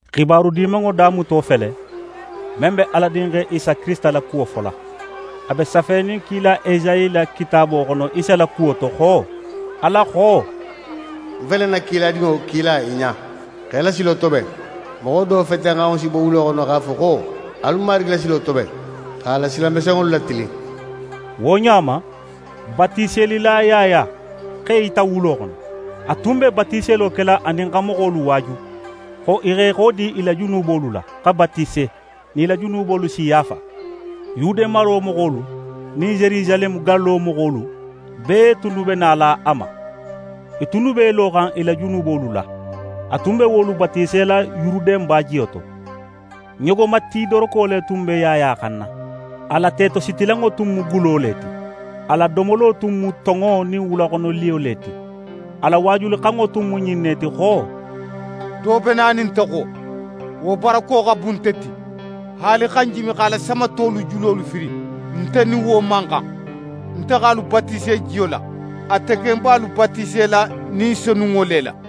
xibaru Dimanŋo damuto fele, men be Ala Dinxe Isa Kirisita la kuwo fola. A be safenin kila Esayi la kitaabo xono Isa la kuwo to xo: Ala xo: «Ń fele ń na kiladinŋo kila í ɲa, xa í la silo toben. Moxo do fetenxanŋo si bo wulo xono x'a fo xo: Alu Marigi la silo toben, x'a la sila mesenŋolu latilin.» Wo ɲa ma, Batiselila Yaya x'é yita wulo xono. A tun be batiselo kela anin xa moxolu waaju xo i x'e xodi i la junubolu la, xa batise, nin i la junubolu si yaafa. Yude maro moxolu nin Yerusaleme gallo moxolu bee tunnu be nala a ma. I tunnu b'e loxan i la junubolu la. A tun be wolu batisela Yuruden bajiyo to. Ɲogomati doroko le tun be Yaya xanna, a la tetositilanŋo tun mu gulo le ti. A la domolo tun mu tonŋo nin wulaxonoliyo le ti. A la waajulixanŋo tun mu ɲin ne ti xo: «Do be nanin nte xo, wo barako xa bun nte ti. Haali xa ń jimi x'a la samatolu julo firin, nte nin wo man xan. Nte x'alu batise jiyo la; ate ken be alu batisela Ni Senunŋo le la.»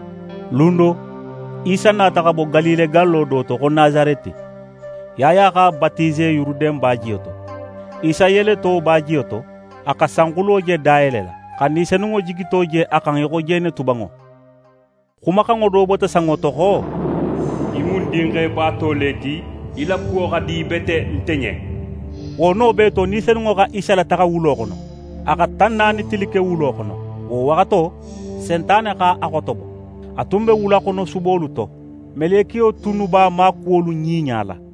Lun do, Isa nata xa bo Galile gallo do to xo Nasareti. Yaya x'a batise Yuruden bajiyo to. Isa yeleto bajiyo to, a xa sanxulo je dayelela, xa Ni Senunŋo jigito je a xan í xo jenetubanŋo. Xumaxanŋo do bota sanŋo to xo: «Í mu ń Dinxe baato le ti; í la kuwo xa di bete nte ɲen.» Wo no bee to, Ni Senunŋo xa Isa lataxa wulo xono. A xa tan naani tili ke wulo xono. Wo waxato, Sentane x'a xotobo. A tun be wulaxonosubolu to. Melekiyo tunnu b'a maakuwolu ɲiɲala.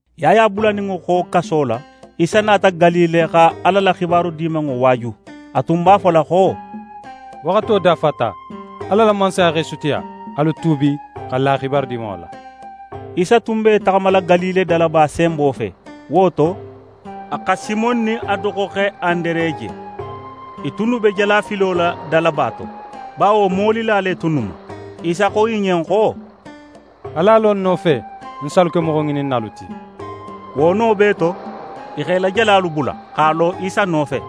Yaya bulaninŋo xo kaso la, Isa nata Galile xa Ala la xibaru Dimanŋo waaju. A tun b'a fola xo: «Waxato dafata; Ala la Mansaya x'é sutiya. Alu tuubi, xa la Xibaru Dimanŋo la.» Isa tun b'é taxamala Galile dalaba senbo fe; wo to, a xa Simon nin a doxoxe Andere je. I tunnu be jalafilo la dalaba to, bawo molila le tunnu mu. Isa xo i ɲen xo: «Alu a lo ń nofe; ń si alu ke moxoŋininnalu ti.» Wo no bee to, i x'e la jalalu bula, x'a lo a nofe.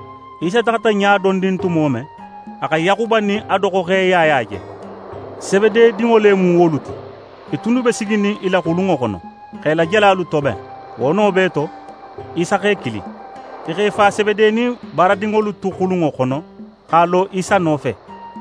Isa taxata ɲa dondin tumo men, a xa Yaxuba nin a doxoxe Yaya je. Sebede dinŋo le mu wolu ti. I tunnu be siginin i la xulunŋo xono, x'e la jalalu toben. Wo no bee to, Isa x'e kili. I x'e fa Sebede nin baaradinŋolu tu xulunŋo xono, x'a lo Isa nofe.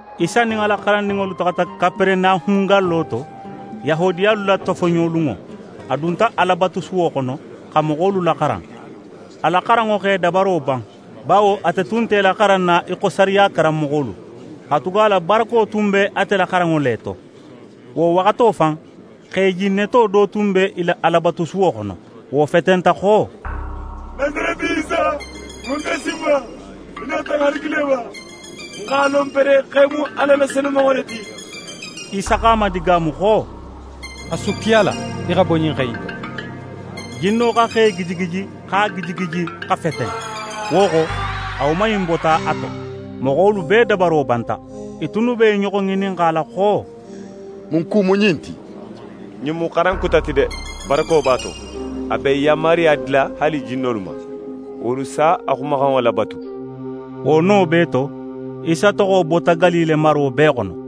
Isa nin a la xarandinŋolu taxata Kaperenahun gallo to. Yahudiyalu la tofoɲolunŋo, a dunta Alabatusuwo xono xa moxolu laxaran. A la xaranŋo x'e dabaro ban, bawo ate tun nte i laxaranna í xo sariya karanmoxolu; katugala barako tun be ate la xaranŋo le to. Wo waxato fan, xe jinneto do tun be i la Alabatusuwo xono. Wo fetenta xo: «Nasareti Isa, mun x'é si n ma? Í nata n halagi le ba? Ń x'a lon pere xo í mu Ala la Senumanŋo le ti.» Isa x'a madigaamu xo: «A sukki a la, í xa bo ɲin xe in to.» Jinno xa xe gijigiji, x'a gijigiji xa feten, wo xo, a woman in bota a to. Moxolu bee dabaro banta. I tunnu be i ɲoxo ŋininxala xo: «Mun ku mu ɲin ti? Ɲin mu xaran kuta ti de! Barako b'a to! A be yanmaruya dila haali jinnolu ma, wolu si a xumaxanŋo labatu.» Wo no bee to, Isa toxo bota Galile maro bee xono.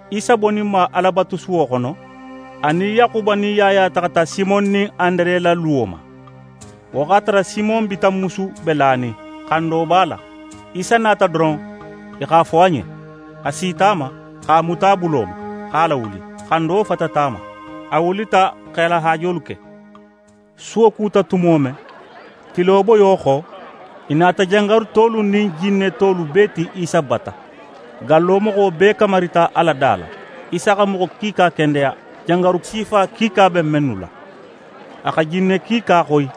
Isa boninma Alabatusuwo xono, a nin Yaxuba nin Yaya taxata Simon nin Andere la luwo ma. Wo x'a tara Simon bitanmusu be lanin, xando b'a la. Isa nata doron, i x'a fo a ɲen. A sita a ma, x'a muta a bulo ma, x'a lawuli. Xando fatata a ma. A wulita x'e la haajolu ke. Suwo kuta tumo men, tilo boyo xo, i nata jangarutolu nin jinnetolu bee ti Isa bata. Gallo moxo bee kamarita a la da la. Isa xa moxo kiika kendeya, jangaru sifa kiika be mennu la. A xa jinne kiika xoyi.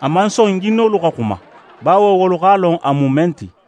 A man son jinnolu xa xuma; bawo wolu x'a lon a mu men ti.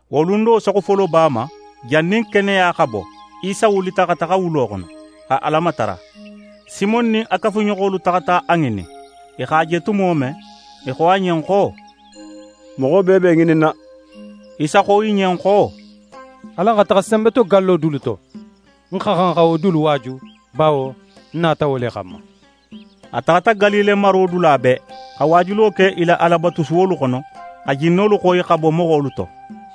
Wo lun do saxufoloba ma, jannin keneya xa bo, Isa wulita xa taxa wulo xono, xa Ala matara. Simon nin a kafuɲoxolu taxata a ŋinin. I x'a je tumo men, i xo a ɲen xo: «Moxo bee be í ŋininna.» Isa xo i ɲen xo: «Alan xa taxa senbetogallo dulu to. Ń xa xan xa wo dulu waaju, bawo ń nata wo le xanma.» A taxata Galile maro dula bee, xa waajulo ke i la Alabatusuwolu xono, xa jinnolu xoyi xa bo moxolu to.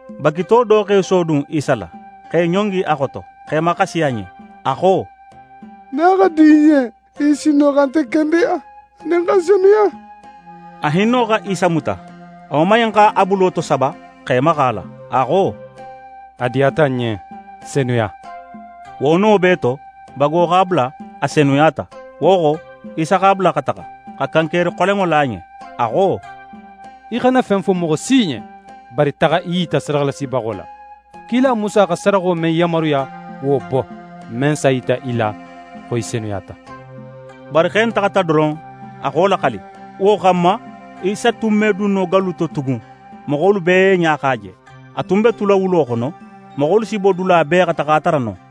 Bagito do x'é sodun Isa la, x'é ɲongi a xoto, x'é maxasi a ɲen. A xo: «Nin a xa di í ɲen, í si sin no xa nte kendeya, anin xa ń senuya.» A hinno xa Isa muta; a woman in x'a bulo tosaba, x'é maxa a la. A xo: «A diyata ń ɲen, senuya!» Wo no bee to, bago x'a bula, a senuyata. Wo xo, Isa x'a bula xa taxa, xa kankeri xolenŋo la a ɲen. A xo: «Í xana fen fo moxo si ɲen, bari taxa í yita sadaxalasibaxo la. Kila Musa xa sadaxo men yanmaruya, wo bo, men s'a yita i la xo í senuyata.» Bari xe in taxata doron, a xa wo laxali. Wo xanma, Isa tun me dun no gallu to tugun, moxolu bee ɲa x'a je. A tun be tula wulo xono. Moxolu si bo dula bee, xa taxa a tara non.